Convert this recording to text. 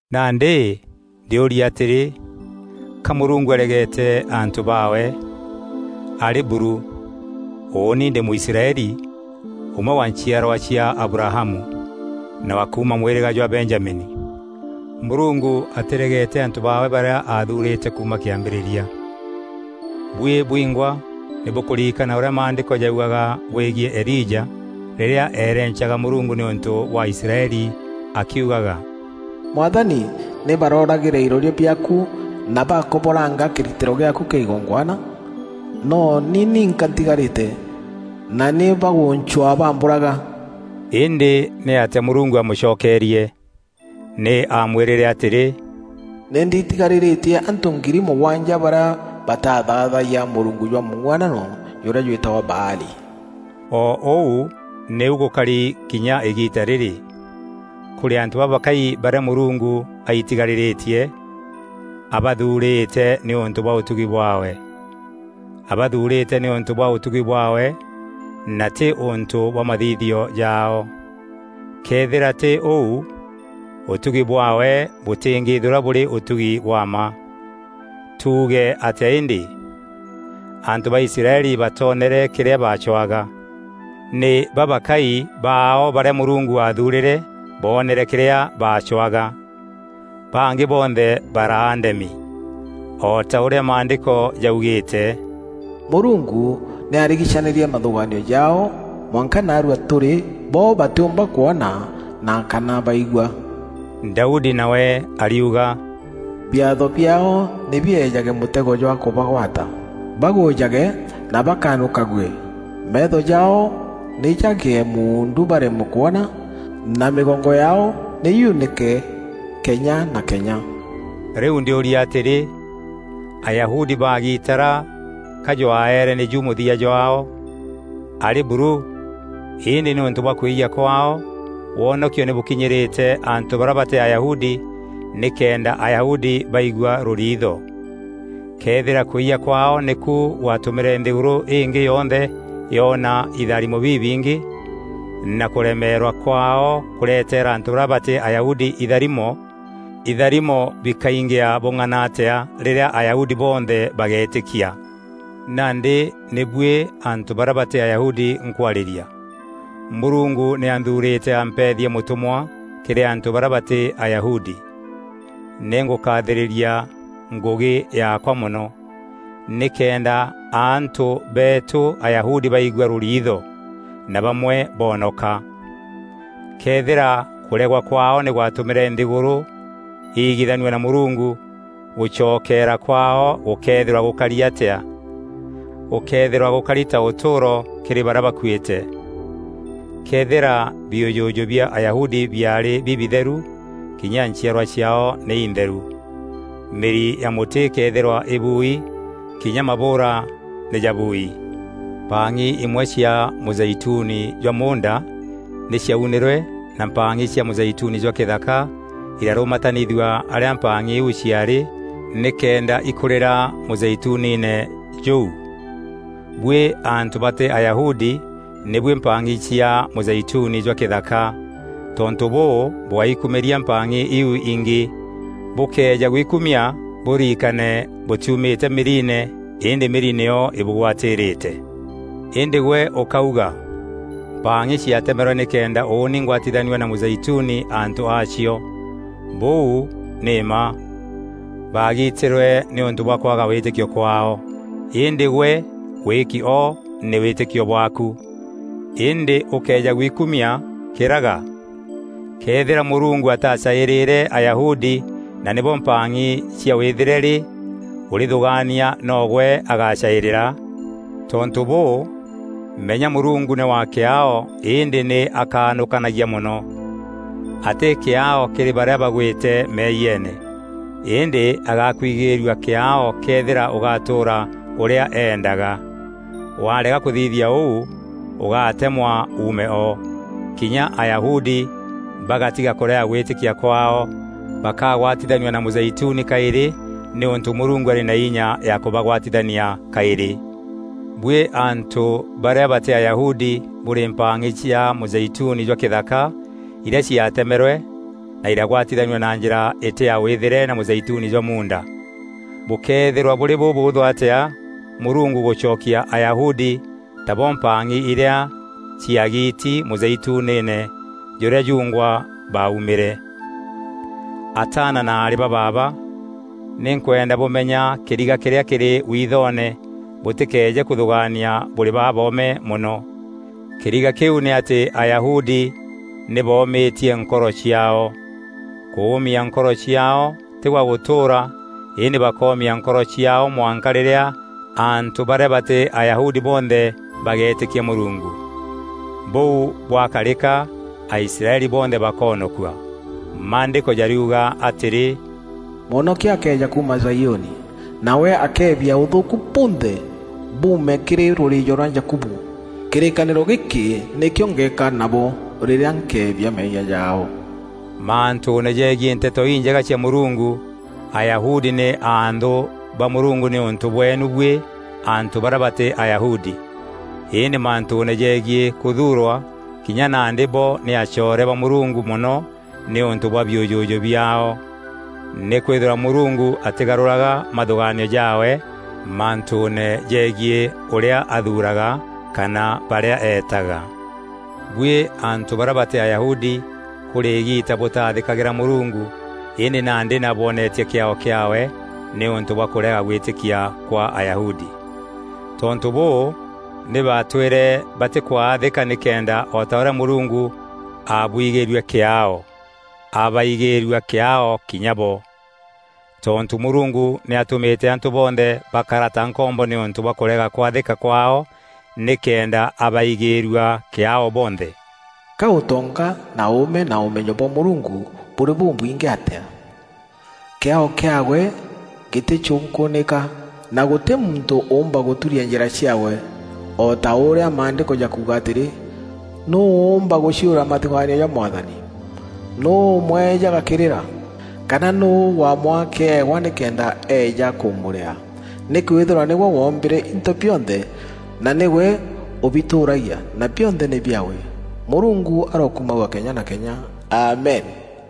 Nandî ndîûrîa atîrî, ka Mûrungu aregete antû baawe? Arî buru! Ûûni ndî Mûisraeli, ûmwe wa nchiarwa cia Abrahamu, na wa kuuma mwîrîga jwa Benjamini. Mûrungu atîregete antû baawe barîa aathuurîte kuuma kîambîrîria. Buî bwingwa nî bûkûririkana ûrîa Maandîko jaugaga bwegiî Elija rîrîa eerencaga Mûrungu nîûntû bwa Aisraeli akiugaga: “Mwathani, nî barooragîre iroria biaaku na bakoboranga kîritîro gîaaku kîa igongwana. No ni ninka ntîgarîte, na nî bagûncwaa bambûraga.” Îndî nîatîa Mûrungu aamûcokerie? Nî aamwîrîre atîrî, “Nî ndiitigarîrîtie antû ngiri mûgwanja barîa batathaathayia mûrungu jwa mûng'uanano jûrîa jwîtagwa Baali.” O ûu nîu gûkari kinya îgiita rîrî: kûrî antû babakai barîa Mûrungu aitigarîrîtie, abathuurîte nîûntû bwa ûtugi bwaawe. Abathuurîte nîûntû bwa ûtugi bwaawe na tî ûntû bwa mathithio jaao. Këethîra tî ûu, ûtugi bwaawe bûtîngîîthîrwa bûrî ûtugi bwa mma. Tuuge atîa îndî? Antû ba Israeli batoonere kîrîa baacwaga. Nî babakai baao barîa Mûrungu aathuurîre boonere kîrîa baacwaga. Bangî bonthe baraa ndemi. O ta ûrîa Maandîko jaugîîte: “Mûrungu nî aarigicanîrie mathûgaanio jaao, mwanka naarua tûrî bo batîûmba kwona na kana baigua.” Daudi nawe ariuga: “Biatho biaao nî biejage mûtego jwa kûbagwata, bagûûjage na bakanûkague. Meetho jaao nî jagîe muundu baremwe kwona, na mîgongo yaao nî yunîke kenya na kenya.” Rîu ndîûrîa atîrî, Ayahudi baagitara ka jwaeere nîju mûthia jwaao? Arî buru! Îndî nîûntû bwa kwîyia kwaao, wonokio nî bûkinyîrîte antû barîa batî Ayahudi nîkenda Ayahudi baigua rûriitho. Këethîra kwîyia kwaao nîku gwatûmîre nthîgûrû îngî yonthe yoona itharimo bibingî, na kûremeerwa kwaao kûretera antû barîa batî Ayahudi itharimo, itharimo bikaingîa bûng'ana atîa rîrîa Ayahudi bonthe bageetîkia! Nandî nî buî antû barîa batî Ayahudi nkwarîria: Mûrungu nî anthuurîte ampeethia mûtûmwa kîrî antû barîa batî Ayahudi. Nî ngûkathîrîria ngûgî yaakwa mono, nîkenda antû beetu Ayahudi baigua rûriitho, na bamwe boonoka. Këethîra kûregwa kwaao nî gwatûmîre nthîgûrû iigithanua na Mûrungu, gûcokeera kwaao gûkeethîrwa gûkarî atîa? Gûkeethîrwa gûkarî ta ûtûûro kîrî barîa bakuîte. Këethîra biûjûjû bia Ayahudi biaarî bibitheru, kinya nchiarwa ciaao nî itheru. Mîri ya mûtî îkeethîrwa îbuui kinya mabûûra nî ja buui. Mpang'i imwe cia mûzeituni jwa muunda nî ciaunîrwe na mpang'i cia mûzeituni jwa kîthaka, îrarûmatanithua arîa mpang'i iu ciaarî nîkenda ikûrîra mûzeituniine jûu. Buî antû batî Ayahudi nî buî mpang'i cia mûzeituni jwa kîthaka. Tontû bûû, bûgáikumîria mpang'i iu ingî. Bûkëeja gwikumia, bûrikane bûtiumîte mîriine îndî mîri nîyo îbûgwatîrîte. Îndî gwe ûkauga: “Mpang'i ciatemerwe nîkenda ûûni ngwatithanua na mûzeituni antû aacio.” Bûu nî mma! Baagiitîrwe nîûntû bwa kwaga wîtîkio kwaao, îndî gwe wîîki o nî wîtîkio bwaaku. Îndî ûkéeja gwikumia, kîraga. Këethîra Mûrungu atacaîrîre Ayahudi na nîbo mpang'i cia wîthîre rî, ûrîthûgaania no gwe agacaîrîra? Tontû bûû, menya Mûrungu nî wa kîaao îndî nî akanûkanagia mono. Atî kîaao kîrî barîa bagwîte meeyiene, îndî agakwigîîrua kîaao këethîra ûgatûûra ûrîa eendaga. Warega kûthithia ûu, ûgatemwa uume o. Kinya Ayahudi bagätiga kûrega gwîtîkia kwaao, bakagwatithanua na mûzeituni kaîrî nîûntû Mûrungu arî na inya ya kûbagwatithania kaîrî. Buî antû barîa batî Ayahudi bûrî mpang'i cia mûzeituni jwa kîthaka irîa ciatemerwe na iragwatithanua na njîra îtî ya wîthîre na mûzeituni jwa muunda. Bûkëethîrwa bûrî bûbûûthû atîa Mûrungu gûcokia Ayahudi, tabo mpang'i irîa ciagiiti, mûzeituniine jûrîa jungwa baaumîre. Ataana na aarî ba baaba, nî nkwenda bûmenya kîriga kîrîa kîrî withoone bûtîkeeje kûthûgaania bûrî baboome mono. Kîriga kîu nî atî Ayahudi nî boomîtie nkoro ciaao. Kûûmia nkoro ciaao tî kwa gûtûûra îndî bakoomia nkoro ciaao mwanka rîrîa antû barîa batî Ayahudi bonthe bageetîkia Mûrungu. Bûu bwakarîka, Aisraeli bonthe bakoonokua. Maandîko jariuga atîrî, “Mwonokia akeeja kuuma Zaiûni, nawe akebia ûthûûku bunthe buume kîrî rûrîîjo rwa Jakubu. Kîrîkanîro gîkî nîkîo ngeeka nabo, rîrîa nkeebia meeyia jaao.” Mantûûne jegiî Nteto Injega cia Mûrungu, Ayahudi nî anthû ba Mûrungu nîûntû bweenu buî antû barîa batî Ayahudi. Îndî mantûûne jegiî kûthuurwa, kinya nandi bo nî acoore ba Mûrungu mono nîûntû bwa biûjûjû biaao. Nîkwîthîrwa Mûrungu atîgarûraga mathûgaanio jaawe mantûûne jegiî ûrîa athuuraga kana barîa eetaga. Buî antû barîa batî Ayahudi kûrî îgiita bûtaathîkagîra Mûrungu îndî nandî nî abwonetie kîaao kîaawe nîûntû bwa kûrega gwîtîkia kwa Ayahudi. Tontû bûû nî batwîre batîkwathîka nîkenda o ta ûrîa Mûrungu aabwigîîrue kîaao, abaigîîrua kîaao kinya bo. Tontû Mûrungu nî atûmîte antû bonthe bakara ta nkombo nîûntû bwa kûrega kwathîka kwaao nîkenda abaigîîrua kîaao bonthe. Ka ûtonga, na ûûme na ûmenyo bwa Mûrungu bûrî bûbwingî atîa! Kîaao kîaawe gîtîcûnkûûnîka, na gûtî muntû ûûmba gûturia njîra ciaawe! O ta ûrîa Maandîko jakuuga atîrî, “Nûû ûûmba gûciûra mathûgaanio ja Mwathani? Nûû ûmwejaga kîrîra? Kana nûû waamwaa kîewa, nîkenda eeja kûmûrîaa?” Nîkwîthîrwa nîwe woombîre into bionthe na nîwe ûbitûûragia na bionthe nî biaawe. Mûrungu arokumagua kenya na kenya! Amen.